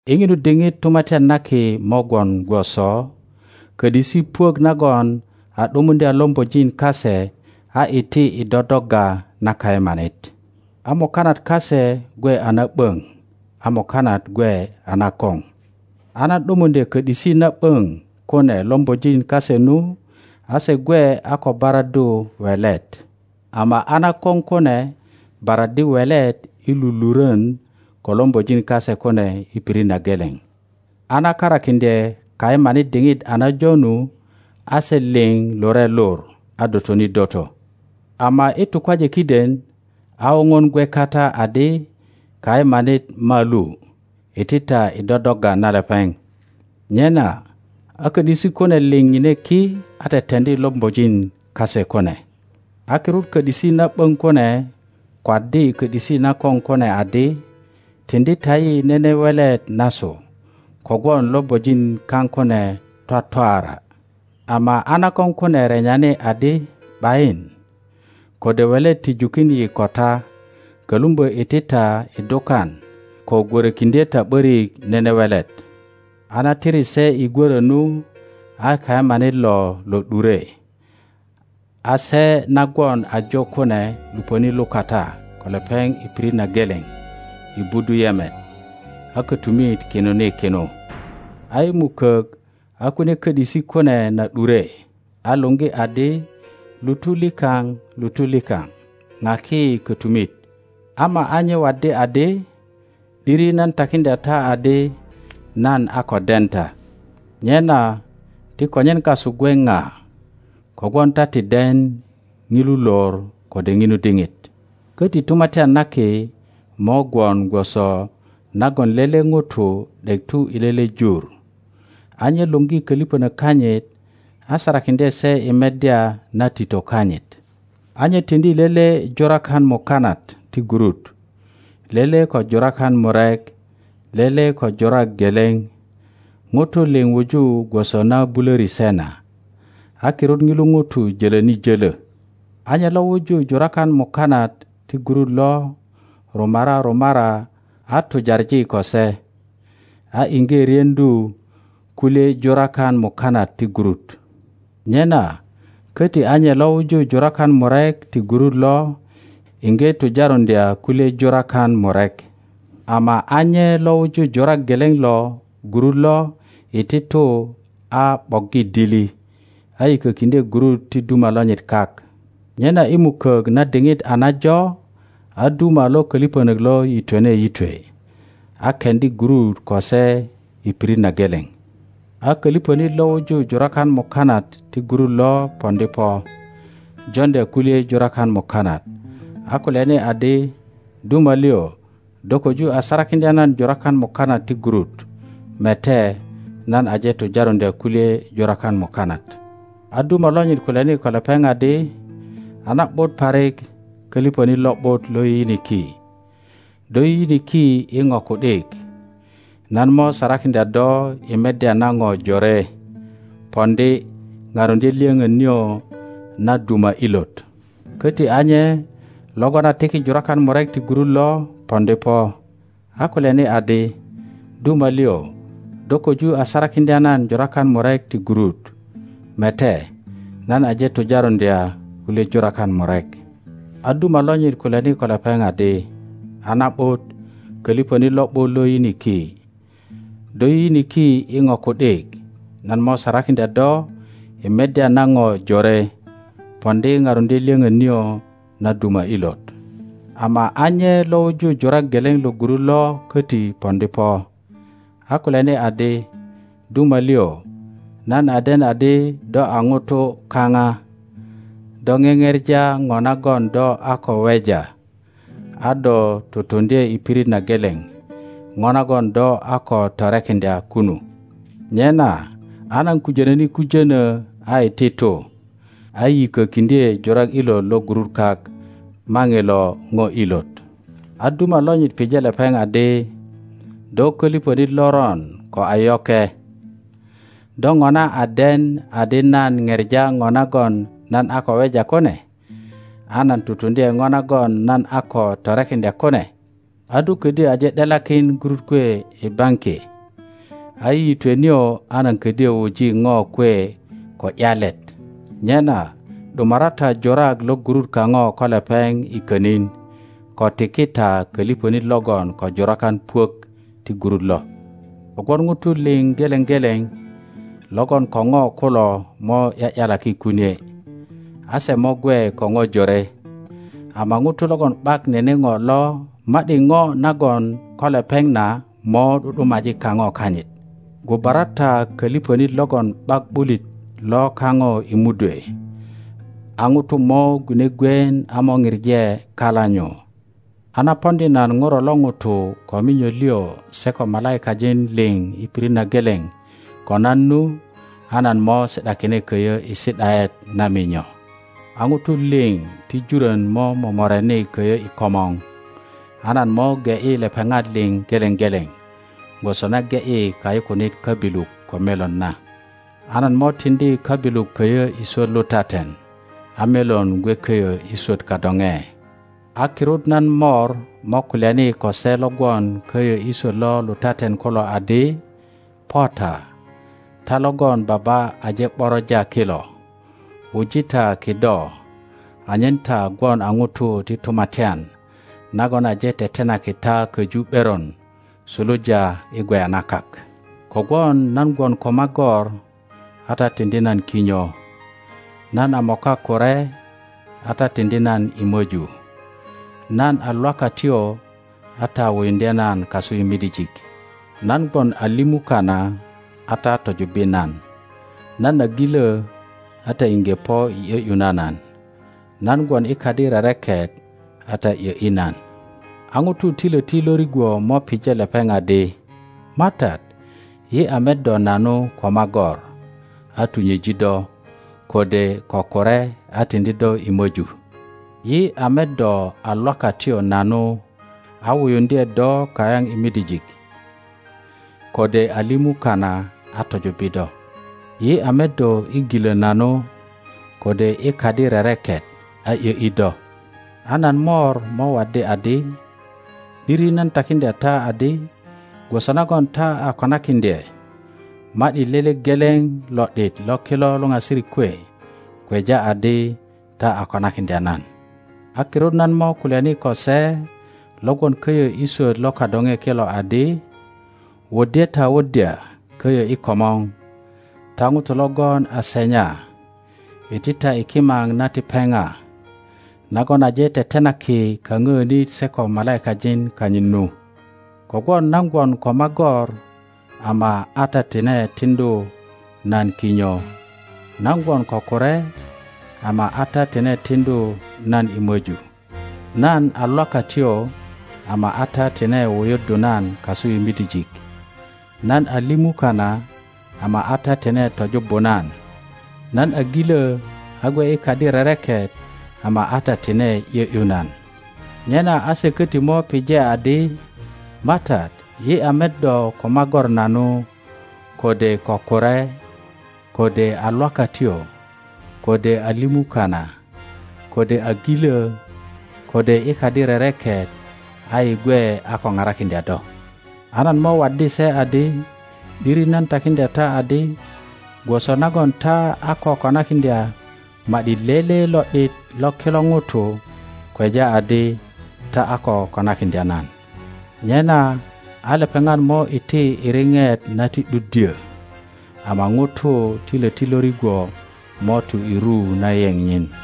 I ŋinu diŋit Tumatyan na Kimo gwon gwoso kö ’disi puök nagon a ’dumuŋdya lombojin kase a iti i dodogga na kayemanit. A mukanat kase gwe a na ’böŋ, a mukanat gwe a nakoŋ. a na ’dumuŋdye kö ’disi na ’böŋ kune lombojin kase nu, a segwe a ko baraddu welet; ama a nakoŋ kune baraddi welet i lulurön ko lombojin kase kune i pirit na geleŋ. A na karakiŋdye kayemanit diŋit a najo nu, a se liŋ lure lur a dotoni doto. Ama i tukwaje kiden, a woŋon gwe kata adi, Kayemanit malu! Iti ta i dodogga ria lepeŋ. Nyena a kö ’disi kune liŋ ŋine ki, a teteŋdi lombojin kase kune. a kirut kö ’disi na ’böŋ kune kwaddi kö ’disi nakoŋ kune adi, Tiŋdi ta yi nene welet nasu, kogwon lombojin kaŋ kune twatwaara. Ama a nakoŋ kune renyani adi, ’Bayin, kode welet ti jukin yi ko ta. Kölumbö iti ta i dukan, ko gwörökiŋdye ta ’börik nene welet. A na tiri se i gwörö nu, a kayemanit lo lo ’dure, a se na gwon ajo kune lupöni lukata ko lepeŋ i pirit na geleŋ i budu yemet, a kötumit kinuni kinu. A i mukok, a kunie kö ’disi kune na ’dure, a luŋgi adi, Lutu likaŋ, lutu likaŋ, ŋaki yi kötumit. Ama a nye waddi adi, ’Diri nan takiŋdya ta adi, nan a ko den ta. Nyena ti konyen kasu gwe ŋa, kogwon ta ti den ŋilu lor kode ŋinu diŋit. Köti Tumatyan na Ki mo gwon gwoso nagon lele ŋuto ’dek tu i lele jur, a nye luŋgi köliŋönök kanyit a sarakiŋdye se i meddya na tito kanyit. A nye tiŋdi lele jurakan mukanat ti gurut, lele ko jurakan murek, lele ko jurak geleŋ, ŋutu liŋ wuju gwoso na bulöri se na. A kirut ŋilo ŋuto jölöni jölö. A nye lo wuju jurakan mukanat ti gurut lo rumara rumara a tujaŋi ko se, a iŋge ryeŋdu kulye jurakan mukanat ti gurut. Nyena köti a nye lo wuju jurakan murek ti gurut lo iŋge tujarundya kulye jurakan murek. Ama a nye lo wuju jurak geleŋ lo gurut lo iti tu a ’boggi dili, a yikökiŋdye gurut ti duma lonyit kak. Nyena i mukök na diŋit a najo, a duma lo köliŋönök lo yitwene yitwe a keŋdi gurut ko se i pirit na geleŋ. a köliŋönit lo wuju jurakan mukanat ti gurut lo poŋdi po, joŋdya kulye jurakan mukanat, a kulyani adi, Duma liŋ, do köju a sarakiŋdya nan jurakan mukanat ti gurut. Mete, nan aje tujaruŋdya kulye jurakan mukanat. a duma lonyit kulyani ko lepeŋ adi, A na ’but parik, köliŋönit lo ’but lo yiyiniki! Do yiyiniki i ŋo ku ’dik; nan mo sarakiŋdya do i meddya na ŋo jore. Poŋdi, paruŋdye lyöŋön nio na duma ilot. Köti a nye logon a tiki jurakan murek ti gurut lo poŋdi po, a kulyani adi, Duma liŋ, do köju a sarakiŋdya nan jurakan murek ti gurut. Mete, nan aje tujaruŋdya kulye jurakan murek. a duma lonyit kulyani ko lepeŋ adi, A na ’but, köliŋönit lo ’but lo yiyiniki! Do yiyiniki i ŋo ku ’dik, nan mo sarakiŋdya do i meddya na ŋo jore. Poŋdi, paruŋdye lyoŋön nio na duma ilot. Ama a nye lo wuju jurak geleŋ lo gurut lo köti poŋdi po, a kulyani adi, Duma liŋ, nan a den adi do a ŋuto kaŋa, do ŋeŋepa ŋo nagon do a ko weja, a do tutuŋdye i pirit na geleŋ ŋo nagon do a ko torekiŋdya kunu. Nyena a nan kujönöni kujönö a iti tu, a yikökiŋdye jurak ilot lo gurut kak. Maŋilo ŋo ilot. A duma lonyit pije lepeŋ adi, Do köliŋönit loron ko a yoke! Do ŋona a den adi nan ŋepa ŋo nagon nan a ko weja kune, a nan tutunuŋdye ŋo nagon nan a ko torekiŋdya kune? A do ködyö aje ’delakin gurut kwe i baŋki, a i yitwe nio a nan ködyö wuji ŋo kwe ko ’yalet. Nyena ’dumara ta jurak lo gurut kaŋo ko lepeŋ i könin, ko tiki ta köliŋönit logon ko jurakan puök ti gurut lo. Kogwon ŋutu liŋ geleŋ geleŋ logon ko ŋo kulo mo ’ya ’yalaki kunie, a se mo gwe ko ŋo jore, ama ŋuto logon ’bak nene ŋo lo, ma ’di ŋo na gwon ko lepeŋ na mo ’du ’dumaji kaŋo kanyit. Gubara ta köliŋönit logon ’bak ’bulit lo kaŋo i mudwe. A ŋutu mo gwine gwien a mo pije kala nyu. A na poŋdi nan Ŋuro lo ŋuto ko minyo liŋ se ko malaikajin liŋ i pirit na geleŋ ko nan nu, a nan mo si ’dakine köyö i si ’daet na minyo. A ŋutu liŋ ti jurön mo momoreni köyö i komor, a nan mo ge ’yi lepeŋat liŋ geleŋ geleŋ, gwoso na ge ’yi kayukunit köbilu ko melon na. a nan mo tiŋdi köbilu köyö i swöt lutaten, a melon gwe köyö i swöt kadoŋe. a kirut nan Mor mo kulyani ko se lo gwon köyö i swöt lo lutaten kulo adi, Po ta, ta logon Baba aje ’boroja kilo, wuji ta kido anyen ta gwon a ŋutu ti Tumatyan nagon aje tetenaki ta köju ’beron suluja i gweya na kak; kogwon nan gwon ko magor, a ta tiŋdi nan kinyo; nan a moka kure, a ta tiŋdi nan i möju; nan a lwakatyo, a ta wuyuŋdye nan kasu i midijik; nan gwon a limu kana, a ta tojubbi nan; nan a gilö, a ta iŋge po i ’yö ’yu na nan. Nan gwon i kadi rereket, a ta ’yö ’yi nan. a ŋutu ti löti lo rigwo mo pije lepeŋ adi. MATAT, yi a met do nanu ko magor, a tunyeji do? kode ko kure, a tiŋdi do i möju? Yi a met do a lwakatyo nanu, a wuyuŋdye do kayaŋ i midijik? kode a limu kana, a tojubbi do? Yi a met do i gilö nanu, kode i kadi rereket, a ’yö ’yi do? A nan Mor mo waddi adi, ’Diri nan takiŋdya ta adi, gwoso nagon ta a konakiŋdye ma ’di lele geleŋ lo ’dit lo kilo luŋasirik kwe, kweja adi ta a konakiŋdya nan. a kirut nan mo kulyani ko se lo gwon köyo i swöt lo kadoŋe kilo adi, Wuddye ta wuddya köyö i komor, ta ŋutu logon a senya. Iti ta i kimap na ti pepa, nagon aje tetenaki kapöönit se ko malaikajin kanyit nu; kogwon nan gwon ko magor, ama a ta tine tiŋdu nan kinyo; nan gwon ko kure, ama a ta tine tiŋdu nan i möju; nan a lwakatyo, ama a ta tine wuyuddu nan kasu i midijik; nan a limu kana, ama a ta tine tojubbu nan; nan a gilö, a gwe i kadi rereket, ama a ta tine ’yö ’yu nan. Nyena a se köti mo pije adi, MATAT, yi a met do ko magor nanu, kode ko kure, kode a lwakatyo, kode a limu kana, kode a gilö, kode i kadi rereket, a yi gwe a ko parakiŋdya do? A nan mo waddi se adi, ’Diri nan takiŋdya ta adi, gwoso nagon ta a ko konakiŋdya ma ’di lele lo ’dit lo kilo ŋutu, kweja adi ta a ko konakiŋdya nan. Nyena a lepeŋat mo iti i ripet na ti ’duddyö, ama ŋutu ti löti lo rigwo mo tu i ru na yeŋ nyin.